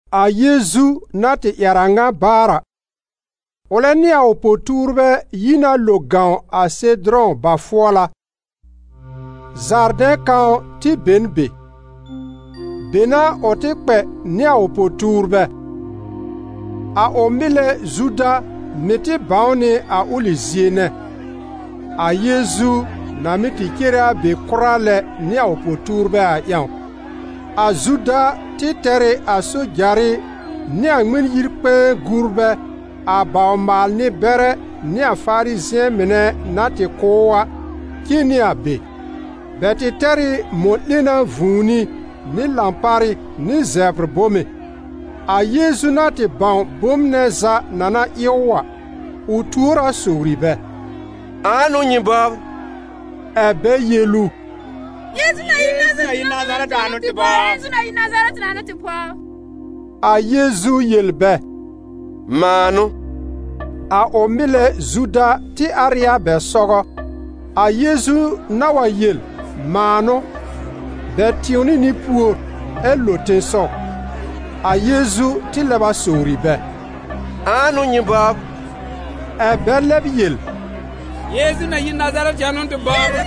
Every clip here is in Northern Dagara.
A Yeezu na tɩ ƴɛr a ŋa baar a, ʋlɛ nɩ a ʋ po-tuurbɛ yi na lo gãw a Sedʋrɔ̃ ba-fʋɔla. Zardɛ̃ kãw tɩ be n be. Be n'a ʋ tɩ kpɛ nɩ a ʋ po-tuurbɛ. A ʋ mɩlɛ Zuda mɩ̀ tɩ bãw nɩ a ʋlɩ zie nɛ: a Yeezu na mɩ́ tɩ cere a be kʋra lɛ nɩ a ʋ po-tuurbɛ a ƴãw. A Zuda tɩ tɛr ɩ a sojarɩ nɩ a Ŋmɩn-yi-kpɛ̃ɛ-gurbɛ a bawr-maal-nɩ-bɛrɛ nɩ a Farizɩ̃ɛ mɩnɛ na tɩ kʋ̀ ʋ a, cen nɩ a be. Bɛ tɩ tɛr ɩ mɔ̃-'lena vũuni nɩ lãparɩ nɩ zɛbr bome. A Yeezu na tɩ bãw bom nɛ za na na ɩ ʋ a, ʋ tuor a sowri bɛ: «Ãa n'ʋ nyɩ bɔbr?» Ɛ bɛ yel ʋ: «Yeezu na yi Nazarɛtɩ a n'ʋ tɩ bɔbr.» A Yeezu yel bɛ: «Mãa n'ʋ.» A ʋ mɩlɛ Zuda tɩ ar ɩ a bɛ sɔgɔ. A Yeezu na wa yel: «Mãa n'ʋ», bɛ tɩ̃wnɩ nɩ pùor, ɛ lo tẽsɔw. A Yeezu tɩ lɛb a sowri bɛ: «Ãa n'ʋ nyɩ bɔbr?» Ɛ bɛ lɛb yel: «Yeezu na yi Nazarɛtɩ a n'ʋ tɩ bɔbr.»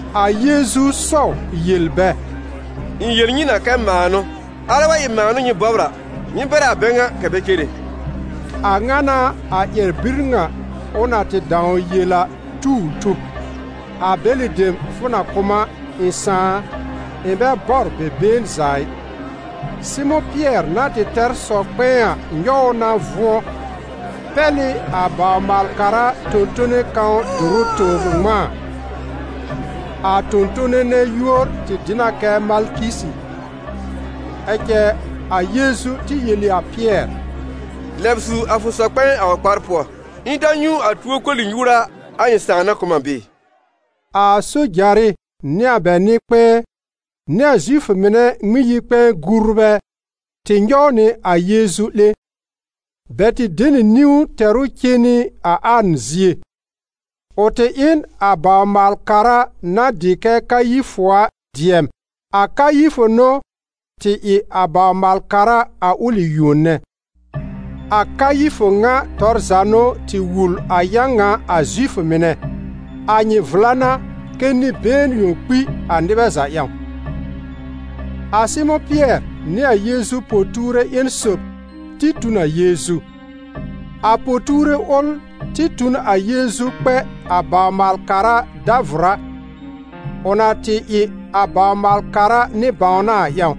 A Yeezu sɔw yel bɛ: «Ɩ̃ yel nyɩ na kɛ mãa n'ʋ. Alɛ wa ɩ mãa n'ʋ nyɩ bɔbr a, nyɩ bɛr a bɛ ŋa kɛ̀ bɛ cere.» A ŋa n'a a ƴɛr-bir ŋa ʋ na tɩ dãw yel a tu ʋ tub: «A bɛlɩ dem fʋ na kʋ̀ m a, ɩ̃ Sãà a, ɩ̃ bɛ bɔr bɛ been za ɩ.» Sɩmʋ̃ Pɩɛr na tɩ tɛr sɔ-kpɛ̃ɛ a nyɔw ʋ na vʋ̃ɔ, pɛl ɩ a bawr-maal-kara tõ-tone kãw dʋrʋ tobr ŋmãa. A tõ-tone nɛ yúor tɩ dɩ na kɛ Malkisi. Ɛ cɛ a Yeezu tɩ yel ɩ a Pɩɛr: «Lɛb su a fʋ sɔ-kpɛ̃ɛ a ʋ kpar pʋɔ. Ɩ̃ ta nyũ a tuo koli-nyuura a ɩ̃ Sãà na kʋ̀ m a bɩɩ?» A sojarɩ nɩ a bɛ nɩ-kpɛ̃ɛ nɩ a Zifʋ mɩnɛ Ŋmɩn-yi-kpɛ̃ɛ-gurbɛ tɩ nyɔw nɩ a Yeezu 'lẽ. Bɛ tɩ de nɩ niwn tɛr ʋ cen nɩ a An zie. Ʋ tɩ ɩ n a bawr-maal-kara na dɩ kɛ Kayifʋ a dɩɛm. A Kayifʋ n'ʋ tɩ ɩ a bawr-maal-kara a ʋlɩ yuon nɛ. A Kayifʋ ŋa tɔr za n'ʋ tɩ wul a yã ŋa a Zifʋ mɩnɛ: «A nyɩ vla n'a kɛ nɩ-been yõ kpi a nɩbɛ za ƴãw.» A Sɩmʋ̃ Pɩɛr nɩ a Yeezu po-tuure ƴẽn sob tɩ tu n a Yeezu. A po-tuure ʋl tɩ tu n a Yeezu kpɛ a bawr-maal-kara dàvʋrá, ʋ na tɩ ɩ a bawr-maal-kara nɩ-bãwna a ƴãw.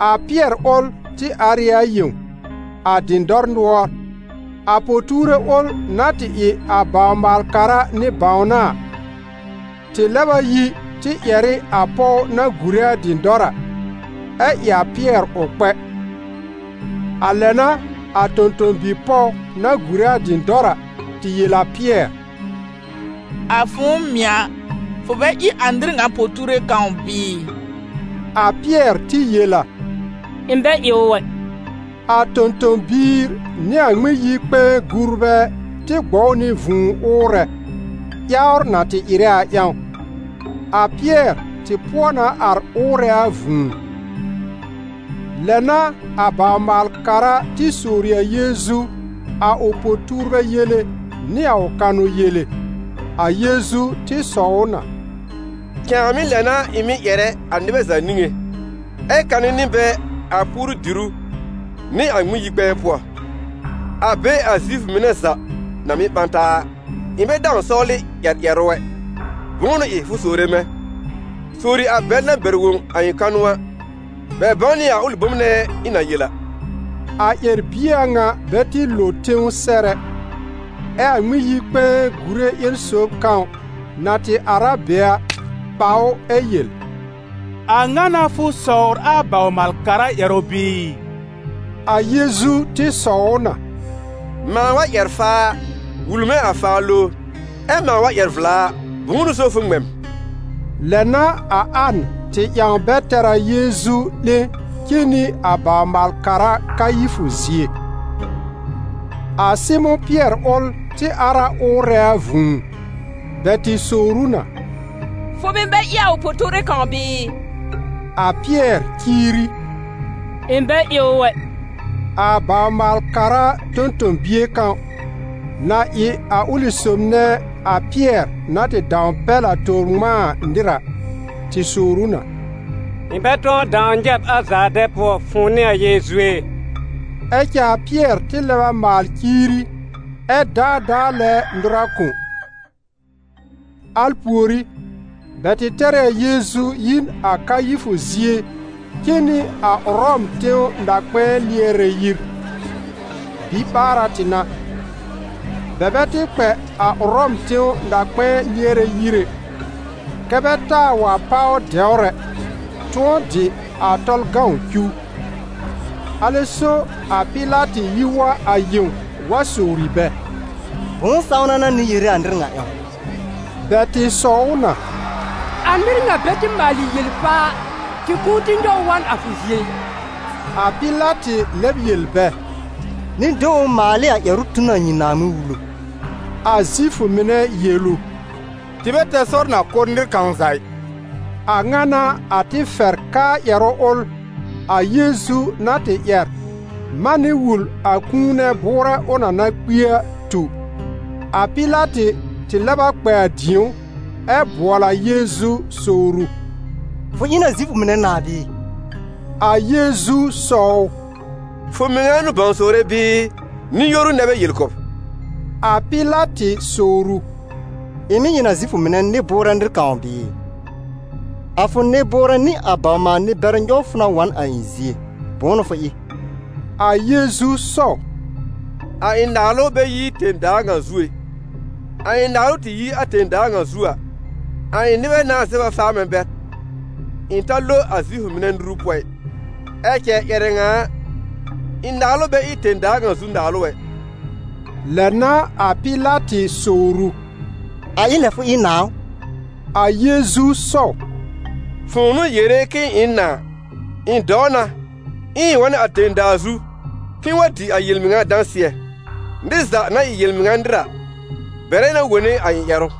A Pɩɛr ʋl tɩ ar ɩ a yẽw, a dɩ̃dɔr nʋɔr. A po-tuure ʋl na tɩ ɩ a bawr-maal-kara nɩ-bãwna a, tɩ lɛb a yi tɩ ƴɛr ɩ a pɔw na gùre a dɩ̃dɔr a, ɛ ɩ a Pɩɛr ʋ kpɛ. A lɛ n'a a tõ-tõ-bi-pɔw na gùre a dɩ̃dɔr a tɩ yel a Pɩɛr: «A fʋ̃ʋ mɩ̀ a, fʋ bɛ ɩ a nɩr ŋa po-tuure kãw bɩɩ?» A Pɩɛr tɩ yel a: «Ɩ̃ bɛ ɩ ʋ ɛ.» A tõ-tõ-biir nɩ a Ŋmɩn-yi-kpɛ̃ɛ-gurbɛ tɩ gbɔw nɩ vũu ʋʋrɛ, ƴawr na tɩ ɩrɛ a ƴãw. A Pɩɛr tɩ pʋɔ na ar ʋʋrɛ a vũu. Lɛ n'a a bawr-maal-kara tɩ sowr ɩ a Yeezu a ʋ po-tuurbɛ yele nɩ a ʋ kanʋ yele. A Yeezu tɩ sɔw ʋ na: «Cãàmɩ́ lɛ n'a ɩ̃ mɩ́ ƴɛrɛ a nɩbɛ za niŋé, ɛ kanɛ nɩ bɛ a puoru-dìrú nɩ a Ŋmɩn-yi-kpɛ̃ɛ pʋɔ, a be a Zifʋ mɩnɛ za na mɩ́ ɓã taa a. Ɩ̃ bɛ dãw sɔwlɩ ƴɛr ƴɛrʋ ɛ. Bʋ̃ʋ n'ʋ ɩ fʋ sowre mɛ̃? Sowri a bɛl na bɛr wõ a ɩ̃ kanʋ a, bɛ bãw nɩ a ʋlɩ bom nɛ ɩ̃ na yel a.» A ƴɛr-bie a ŋa bɛ tɩ lo tẽw sɛr ɛ, ɛ a Ŋmɩn-yi-kpɛ̃ɛ gùre ƴẽn sob kãw, na tɩ ar a be a, ɓa ʋ ɛ yel: «A ŋa n'a fʋ sɔwr a bawr-maal-kara ƴɛrʋ bɩɩ?» A Yeezu tɩ sɔw ʋ na: «Mãa wa ƴɛr faa a, wul mɛ̃ a faa lowr; ɛ mãa wa ƴɛr vla a, bʋ̃ʋ n'ʋ so fʋ ŋmɛ m?» Lɛ n'a a An tɩ ƴãw bɛ tɛr a Yeezu 'lẽ cen nɩ a bawr-maal-kara Kayifʋ zie. A Sɩmʋ̃ Pɩɛr ʋl tɩ ar a ʋʋrɛ a vũu. Bɛ tɩ sowr ʋ na: «Fʋ mɩ̀ bɛ ɩ a ʋ po-tuure kãw bɩɩ?» A Pɩɛr ciiri: «Ɩ̃ bɛ ɩ ʋ ɛ.» A bawr-maal-kara tõ-tõ-bie kãw, na ɩ a ʋlɩ sob nɛ a Pɩɛr na tɩ dãw pɛl a tobr ŋmãa a nɩr a, tɩ sowr ʋ na: «Ɩ̃ bɛ tʋ̃ɔ dãw nyɛ̃ b a zaardɛ̃ pʋɔ, fʋ̃ʋ nɩ a Yeezu ɛ?» Ɛ cɛ a Pɩɛr tɩ lɛb a maal ciiri, ɛ daadaa lɛ nʋra kõ. Al pùorí, bɛ tɩ tɛr ɩ a Yeezu yi n a Kayifʋ zie cen nɩ a Ʋrɔm tẽw na-kpɛ̃ɛ lɩɛrɛ yir. Biɓaara tɩ n'a. Bɛ bɛ tɩ kpɛ a Ʋrɔm tẽw na-kpɛ̃ɛ lɩɛrɛ yir ɛ, kɛ́ bɛ taa wa páw dɛwr ɛ, tʋ̃ɔ dɩ a Tɔlʋ cuw. Alɛ so a Pɩlatɩ yi wa a yẽw wa sowri bɛ: «Bʋ̃ʋ sãwna n'a nyɩ yere a nɩr ŋa ƴãw?» Bɛ tɩ sɔw ʋ na: «A nɩr ŋa bɛ tɩ maalɩ yel-faa a, tɩ kʋ̃ʋ tɩ nyɔw ʋ wa n a fʋ zie ɩ.» A Pɩlatɩ lɛb yel bɛ: «Nyɩ de ʋ maal ɩ a ƴɛrʋ tu n a nyɩ Naaŋmɩn-Wulu.» A Zifʋ mɩnɛ yel ʋ: «Tɩ bɛ tɛr sɔr na kʋ́ nɩr kãw za ɩ!» A ŋa n'a a tɩ fɛr kɛ a ƴɛrʋ ʋl, a Yeezu na tɩ ƴɛr manɩ wul a kũu nɛ bʋʋrɛ ʋ na na kpi a, tu. A Pɩlatɩ tɩ lɛb a kpɛ a dĩ̀ó, ɛ bʋɔl a Yeezu sowr ʋ: «Fʋ ɩ n a Zifʋ mɩnɛ nãà bɩɩ?» A Yeezu sɔw ʋ: «Fʋ mɩŋa n'ʋ bãw sowre bɩɩ, nɩ-yoru nɛ bɛ yel kʋ̀ b?» A Pɩlatɩ sowr ʋ: «Ɩ̃ mɩ̀ ɩ n a Zifʋ mɩnɛ nɩ-bʋʋrɛ nɩr kãw bɩɩ? A fʋ nɩ-bʋʋrɛ nɩ a bawr-maal-nɩ-bɛrɛ nyɔw fʋ na wa n a ɩ̃ zie, bʋ̃ʋ n'ʋ fʋ ɩ?» A Yeezu sɔw: «A ɩ̃ naalʋ bɛ yi tẽ-daa ŋa zu ɛ. A ɩ̃ naalʋ tɩ yi a tẽ-daa ŋa zu a, a ɩ̃ nɩbɛ nãá zɛb a faa mɛ̃ bɛr, ɩ̃ ta lo a Zifʋ mɩnɛ nuru pʋɔ ɩ. Ɛ cɛ ƴɛrɛ ŋa a, ɩ̃ naalʋ bɛ ɩ tẽ-daa ŋa zu naalʋ ɛ.» Lɛ n'a a Pɩlatɩ sowr ʋ: «A ɩ lɛ fʋ ɩ nãà ʋ?» A Yeezu sɔw: «Fʋ̃ʋ n'ʋ yere k'ɩ̃ɩ ɩ n nãà. Ɩ̃ dɔw na, ɛ ɩ̃ wa n a tẽ-daa zu k'ɩ̃ɩ wa dɩ a yel-mɩŋa dãsɩɛ. Nɩr za na ɩ yel-mɩŋa nɩr a, bɛrɛ na wone a ɩ̃ ƴɛrʋ.»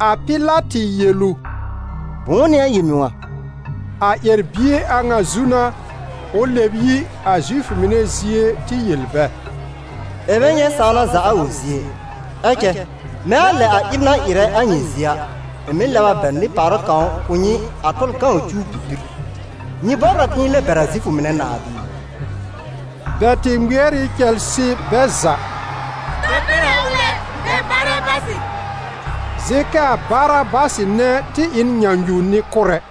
A Pɩlatɩ yel ʋ: «Bʋ̃ʋ n'ɩ a yel-mɩŋa?» A ƴɛr-bie a ŋa zu n'a, ʋ lɛb yi a Zifʋ mɩnɛ zie tɩ yel bɛ: «Ɩ̃ bɛ nyɛ̃ sãwna za a ʋ zie ɛ. Ɛ cɛ mɛ̃ a lɛ a ɩb na ɩrɛ a nyɩ zie a, ɩ̃ mɩ́ lɛb a bɛr nɩ-pàwra kãw kʋ̀ nyɩ a Tɔlʋ cuw bibir. Nyɩ bɔbr a k'ɩ̃ɩ lɛb bɛr a Zifʋ mɩnɛ nãà bɩɩ?» Bɛ tɩ ŋmɩɛr ɩ cɛlsɩ bɛ za: «Ta bɛr a ʋl ɛ, bɛr Barabasɩ!» Zɩ̃ kɛ a Barabasɩ nɛ tɩ ɩ n nyãnyu-nɩ-kʋ́rɛ.